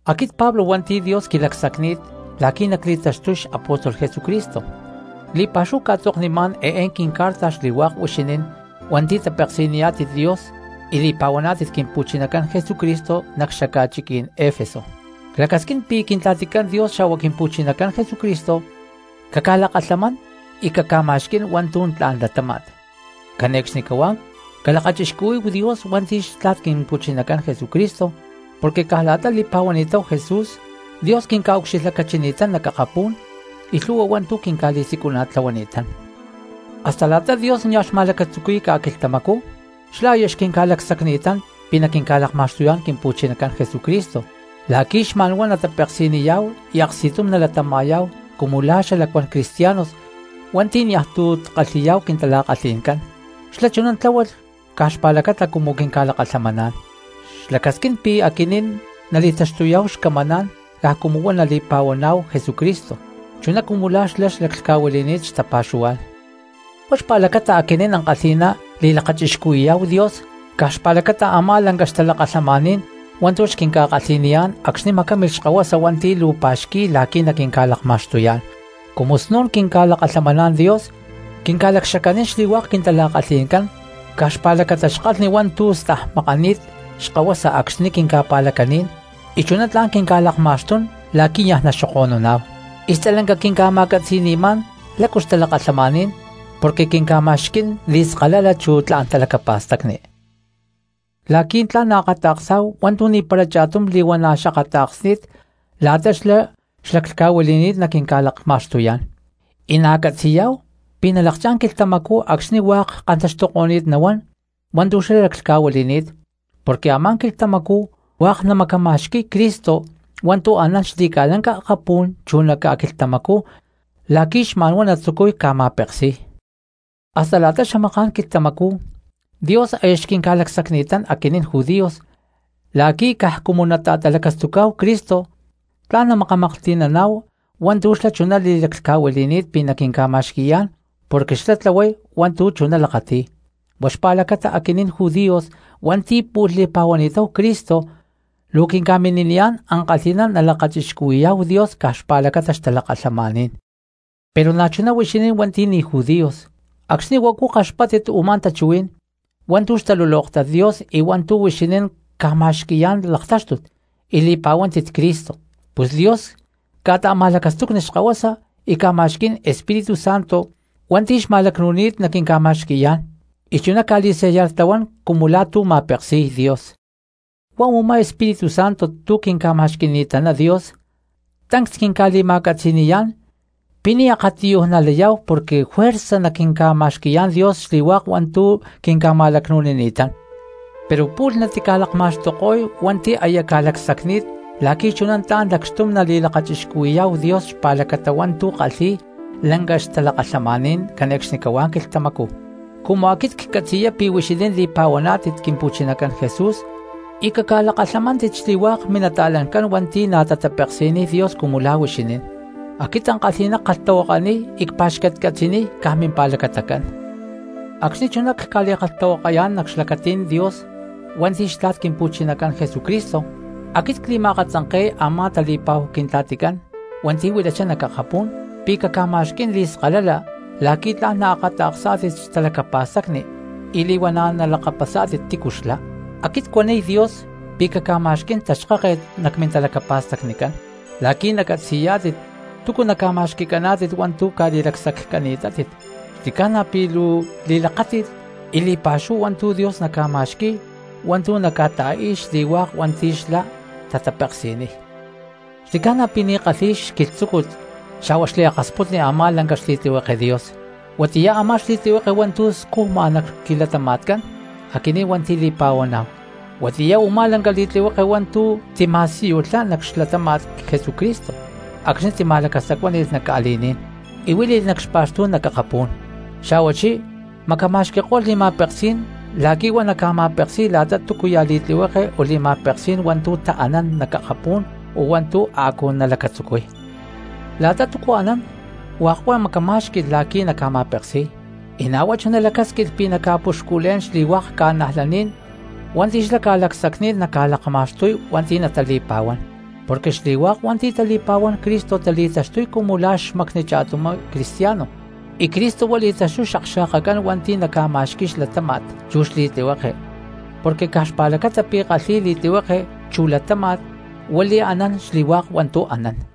Aquit Pablo hua̠nti̠ Dios quilacsacni̠t la̠qui̠ nacli̠taxtuy xapóstol Jesucristo, li̠pa̠xúhu cca̠tzoknimá̠n eé quincarta xli̠hua̠k huixinín hua̠nti̠ tapeksi̠niyá̠tit Dios y li̠pa̠huaná̠tit Quimpu̠chinacán Jesucristo nac xaca̠chiquí̠n Efeso. Clacasquín pi̠ Quintla̠ticán Dios xa̠hua Quimpu̠chinacán Jesucristo caca̠lakalhamán y caca̠ma̠xquí̠n hua̠ntu̠ tla̠n latáma̠t. Cane̠cxnicahuá calakachixcuhuí̠hu Dios hua̠nti̠ xtla̠t Quimpu̠chinacán Jesucristo, porque caj la̠ta li̠pa̠huani̠táhu Jesús Dios quinca̠ucxilhlacachini̠tán nac akapú̠n y lhu̠hua hua̠ntu̠ quinca̠li̠siculana̠tlahuani̠tán. Hasta la̠ta Dios nia̠ xma̠lacatzuqui̠y ca̠quilhtamacú xlá aya xquinca̠lacsacni̠tán pi̠ naquinca̠lakma̠xtuyá̠n Quimpu̠chinacán Jesucristo, la̠qui̠ xma̠nhuá natapeksi̠niyá̠hu y aksti̠tum nalatama̠yá̠hu cumu la̠ xalacuán cristianos hua̠nti̠ niaj tu̠ kalhi̠yá̠hu quintala̠kalhi̠ncán. Xlá chuná tláhualh caj xpa̠lacata cumu quinca̠lakalhamaná̠n, xlacasquín pi̠ aquinín nali̠taxtuyá̠hu xcamaná̠n caj cumu huá nali̠pa̠huaná̠hu Jesucristo chuná cumu la̠ xlá xlaclhca̠huili̠ni̠t xtapa̠xuhuá̠n. Huá xpa̠lacata aquinín ankalhi̠ná li̠lakachixcuhui̠yá̠hu Dios caj xpa̠lacata a̠má lanca xtalakalhamaní̠n hua̠ntu̠ xquinca̠kalhi̠niyá̠n acxni̠ macámilh xkahuasa hua̠nti̠ luu pa̠xqui̠y la̠qui̠ naquinca̠lakma̠xtuyá̠n. Cumu snu̠n quinca̠lakalhamaná̠n Dios quinca̠lacxacanín xli̠hua̠k quintala̠kalhi̠ncán caj xpa̠lacata xkalhni hua̠ntu̠ stajmakani̠t xkahuasa acxni̠ quinca̠pa̠lacaní̠n y chuná tla̠n quinca̠lakma̠xtún la̠qui̠ niaj naxoko̠nuná̠hu. Y stalanca quinca̠ma̠catzi̠ni̠má̠n lácu xtalakalhamaní̠n porque quinca̠ma̠xquí̠n li̠skalala chu tla̠n talacapa̠stacni la̠qui̠ tla̠n naakata̠ksá̠hu hua̠ntu̠ ni̠para cha̠tum li̠huana̠ xakata̠ksni̠t la̠ta xlá xlaclhca̠huili̠ni̠t naquinca̠lakma̠xtuyá̠n. Y na̠ catzi̠yá̠hu pi̠ nalakchá̠n quilhtamacú acxni̠ hua̠k kantaxtuko̠ni̠t nahuán hua̠ntu̠ xlá laclhca̠huili̠ni̠t, porque a̠má quilhtamacú hua̠k namacama̠xqui̠y Cristo hua̠ntu̠ anán xli̠ca̠lanca akapú̠n chu nac ca̠quilhtamacú la̠qui̠ xma̠nhuá natzucuy ca̠ma̠peksí̠y. Hasta la̠ta xamaká̠n quilhtamacú Dios aya xquinca̠lacsacni̠taná aquinín judíos la̠qui̠ caj cumu nata̠talacastucá̠hu Cristo chuná tla̠n namakamaklhti̠naná̠hu hua̠ntu̠ xlá chuná li̠laclhca̠huili̠ni̠t pi̠ naquinca̠ta̠i̠yá̠n, porque xlá tlahuay hua̠ntu̠ chuná lakati̠y. Huá xpa̠lacata, aquinín judíos hua̠nti̠ pu̠lh li̠pa̠huani̠táhu Cristo, luu quinca̠mini̠niyá̠n ankalhi̠ná nalakachixcuhui̠yá̠hu Dios caj xpa̠lacata xtalakalhamaní̠n. Pero na̠chuná huixinín hua̠nti̠ ni̠ judíos acxni̠ huacu kaxpáttit u̠má tachuhuí̠n hua̠ntu̠ xtalulóktat Dios y hua̠ntu̠ huixinín ca̠ma̠xqui̠yá̠n laktáxtut y li̠pa̠huántit Cristo, pus Dios ca̠ta̠ma̠lacastucni xkahuasa y ca̠ma̠xquí̠n Espíritu Santo hua̠nti̠ xma̠lacnu̠ni̠t naquinca̠ma̠xqui̠yá̠n, y chuná ca̠li̠sellartlahuán cumu la̠ tu̠ ma̠peksi̠y Dios. Huá a̠má Espíritu Santo tu̠ quinca̠ma̠xqui̠ni̠taná Dios tancs quinca̠li̠ma̠catzi̠ni̠yá̠n pi̠ ni̠ akatiyuj nalayá̠hu porque juerza naquinca̠ma̠xqui̠yá̠n Dios xli̠hua̠k hua̠ntu̠ quinca̠ma̠lacnu̠nini̠tán; pero pu̠lh natica̠lakma̠xtuko̠y hua̠nti̠ aya ca̠lacsacni̠t, la̠qui̠ chuná tla̠n lacxtum nali̠lakachixcuhui̠yá̠hu Dios xpa̠lacata hua̠ntu̠ kalhi̠y lanca xtalakalhamaní̠n cane̠cxnicahuá quilhtamacú. Cumu aquit ccatzi̠y pi̠ huixinín li̠pa̠huaná̠tit Quimpu̠chinacán Jesús y ca̠lakalhamaná̠tit xli̠hua̠k minata̠lancán hua̠nti̠ na̠ tatapeksi̠niy Dios cumu la̠ huixinín, aquit ankalhi̠ná ckalhtahuakaniy y cpa̠xcatcatzi̠niy caj mimpa̠lacata. Acxni̠ chuná cca̠li̠kalhtahuakayá̠n nac xlacatí̠n Dios hua̠nti̠ xtla̠t Quimpu̠chinacán Jesucristo, aquit cli̠ma̠akatzanke̠y a̠má tali̠pa̠hu Quintla̠ticán hua̠nti̠ huilachá nac akapú̠n pi̠ caca̠ma̠xquí̠n li̠skalala la̠qui̠ tla̠n naakata̠ksá̠tit xtalacapa̠stacni y li̠huana̠ nalakapasá̠tit tícu xlá. Aquit cuaniy Dios pi̠ caca̠ma̠xquí̠n taxkáket nac mintalacapa̠stacnicán la̠qui̠ nacatzi̠yá̠tit túcu naca̠ma̠xqui̠caná̠tit hua̠ntu̠ ca̠li̠lacsaccani̠tátit; xli̠ca̠na pi̠ luu li̠lakáti̠t y li̠pa̠xúhu hua̠ntu̠ Dios naca̠ma̠xqui̠y hua̠ntu̠ naca̠ta̠i̠y xli̠hua̠k hua̠nti̠ xlá tatapeksi̠niy. Xli̠ca̠na pi̠ ni̠ kalhi̠y xquilhtzúcut xa̠hua xliakasputni a̠má lanca xli̠tlihueke Dios, huatiyá a̠má xli̠tlihueke hua̠ntu̠ scujma nac quilatama̠tcán aquinín hua̠nti̠ li̠pa̠huaná̠hu. Huatiyá u̠má lanca xli̠tlihueke hua̠ntu̠ tima̠siyulhá nac xlatáma̠t Jesucristo acxni̠ tima̠lacastacuáni̠lh nac ca̠li̠ní̠n y huíli̠lh nac xpa̠xtú̠n nac akapú̠n, xa̠huachí macama̠xqui̠ko̠lh li̠ma̠peksí̠n la̠qui̠ huá naca̠ma̠peksi̠y la̠ta túcuya̠ li̠tlihueke o li̠ma̠peksí̠n hua̠ntu̠ taanán nac akapú̠n o hua̠ntu̠ a̠cu nalacatzucuy. La̠ta túcu anán hua̠k huá macamá̠xqui̠lh la̠qui̠ naca̠ma̠peksi̠y, y na̠ huá chuná lacásquilh pi̠ naca̠puxculé̠n xli̠hua̠k ca̠najlaní̠n hua̠nti̠ xlá ca̠lacsacni̠t naca̠lakma̠xtuy hua̠nti̠ natali̠pa̠huán. Porque xli̠hua̠k hua̠nti̠ tali̠pa̠huán Cristo tali̠taxtuy cumu la̠ xmacni cha̠tumá cristiano y Cristo huá li̠taxtuy xakxa̠kacán hua̠nti̠ naca̠ma̠xqui̠y xlatáma̠t chu xli̠tlihueke, porque caj xpa̠lacata pi̠ kalhi̠y li̠tlihueke chu latáma̠t huá li̠anán xli̠hua̠k hua̠ntu̠ anán.